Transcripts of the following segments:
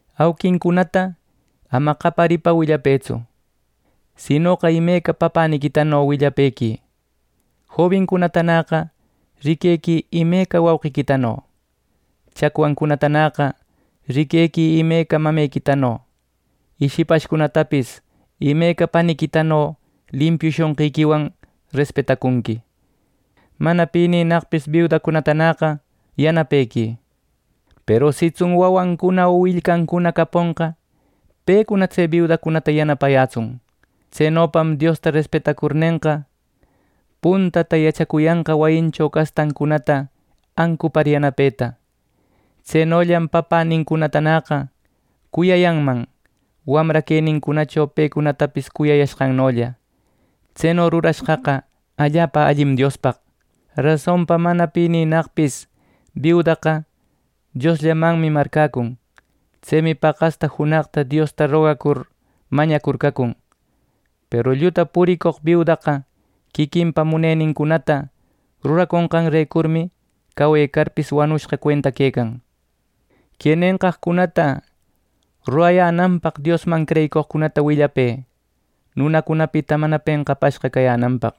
Auquincunata ama qaparipa willapëtsu; sinoqa imeca papäniquitano willapëquï. Jobincunatanäqa riquequï imeca wauqiquitano. Chacwancunatanäqa riquequï imeca mamequitano, y shipashcunatapis imeca paniquitano limpiu shonqiquiwan respetacunqui. Mana pininnaqpis biudacunatanäqa yanapequï. Peru sitsun wawancuna o willcancuna caponqa, pecuna tse biudata yanapayätsun. Tsenopam Diosta respetacurnenqa, puntata yachacuyanqa wayincho castancunata ancupar yanapeta. Tsenollam papänincunatanäqa cuyayanman wamra quenincunacho pecunatapis cuyayashqannolla. Tseno rurashqaqa allapa allim Diospaq. Rasonpa mana pininnaqpis biudaqa Diosllamanmi marcäcun. Tsemi paqasta junaqta Diosta rogacur mañacur cacun. Peru lluta puricoq biudaqa quiquinpa munenincunata ruraconqanrecurmi, cawecarpis wanushqa cuenta quecan. Que nenqaqcunata rurayänanpaq Diosman creyicoqcunata willapë nunacunapita mana penqapashqa cayänanpaq.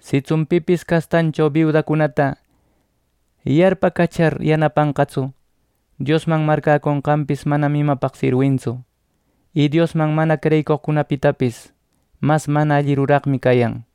Sitsun pipis castancho biudacunata yarpacachar yanapanqatsu, Diosman marcäconqanpis manam imapaqpis sirwintsu, y Diosman mana creyicoqcunapitapis mas mana alli ruraqmi cayan.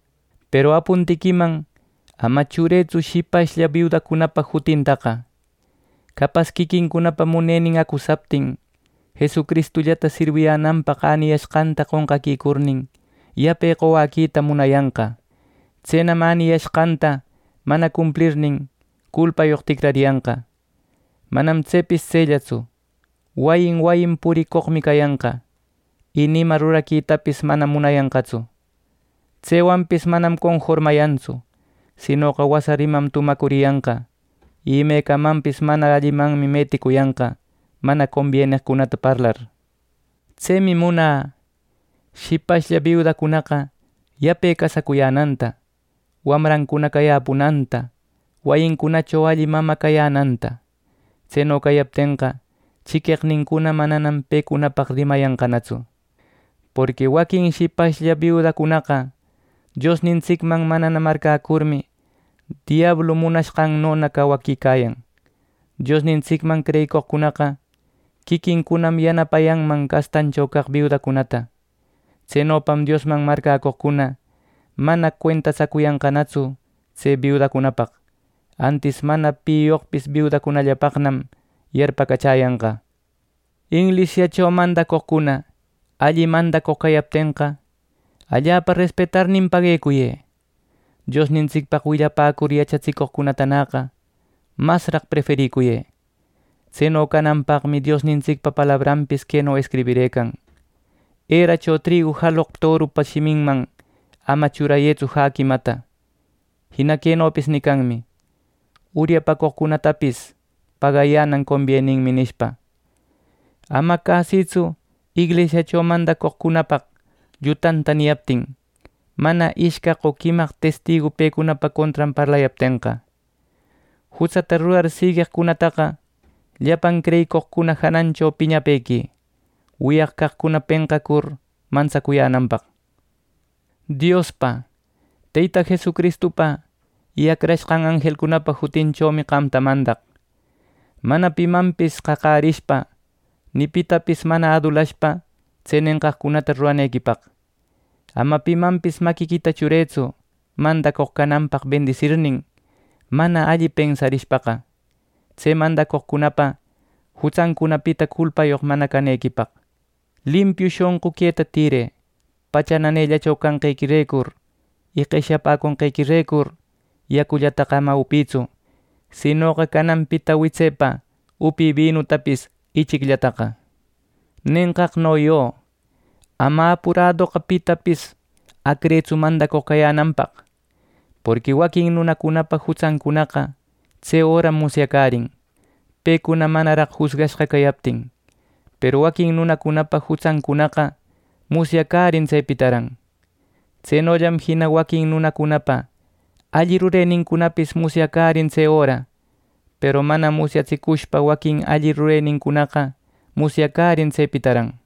Peru apuntiquiman ama churëtsu shipashlla biudacunapa jutintaqa. Capas quiquincunapa munenin acusaptin, Jesucristullata sirwiyänanpaq äniyanqanta qonqaquicurnin, yape qowäquita munayanqa. Tsenam änicuyashqanta mana cumplirnin, culpayoq ticrariyanqa. Manam tsepis tsellatsu. Wayin wayin puricoqmi cayanqa, y ni ima ruraquitapis manam munayanqatsu. Tsewanpis manam conformayantsu; sinoqa wasa rimam tumacuriyanqa, imecamanpis mana allimanmi meticuyanqa mana combieneqcunata parlar. Tsemi munä shipashlla biudacunaqa yape casacuyänanta, wamrancuna cayäpunanta, wayincunacho alli mamä cayänanta. Tseno cayaptenqa, chiqueqnincuna mananam pecunapaq rimayanqanatsu. Porqui waquin shipashlla biudacunaqa Diosnintsicman manana marcäcurmi, diablu munashqannona cawaquicayan. Diosnintsicman creyicoqcunaqa quiquincunam yanapanan castancho caq biudacunata. Tsenopam Diosman marcäcoqcuna mana cuentatsaconqanatsu tse biudacunapaq. Antis mana piyoqpis biudacunallapaqnam yarpacachäyanqa. Inglisiacho mandacoqcuna alli mandacoq cayaptenqa, allapa respetarnin paguecuyë. Diosnintsicpaq willapäcur yachatsicoqcunatanäqa masraq ˻prefericuyë˼. Tseno cananpaqmi Diosnintsicpa palabranpis queno escribirëcan: “Eracho trigu jaloq torupa shiminman ama churayëtsu jäquimata.” Jina quenopis nicanmi: “Uryapucoqcunatapis pagayänan conbieninmi” nishpa. Ama cäsïtsu inglisiacho mandacoqcunapaq llutanta niyaptin, mana ishcaq o quimaq testigu pecunapa contran parlayaptenqa. Jutsata rurar sigueqcunataqa llapan creyicoqcuna janancho piñapequï, wiyaq caqcuna penqacur mantsacuyänanpaq. Diospa, Teyta Jesucristupa y acrashqan anjelcunapa jutinchomi qamta mandaq, mana pimanpis qaqärishpa, ni pitapis mana adulashpa tse nenqaqcunata ruranequipaq. Ama pimanpis maquiquita churëtsu ˻mandacoq cananpaq bendisirnin,˼ mana alli pensarishpaqa, tse mandacoqcunapa jutsancunapita culpayoq mana canequipaq. Limpiu shonqu queta tïrë. Pacha nanellacho canqequirecur y qeshyapäconqequirecur, yacullataqa ama upïtsu; sinoqa cananpita witsepa upï binutapis ichicllataqa. ˻Nenqaqno yö, ama apuradoqa pitapis acrëtsu mandacoq cayänanpaq, porqui˼ waquin nunacunapa jutsancunaqa tse öram musyacärin, pecuna manaraq jusgashqa cayaptin. Peru waquin nunacunapa jutsancunaqa musyacärin tsepitaran. Tsenollam jina waquin nunacunapa alli rurenincunapis musyacärin tse öra, peru mana musyatsicushpa waquin alli rurenincunaqa musyacärin tsepitaran.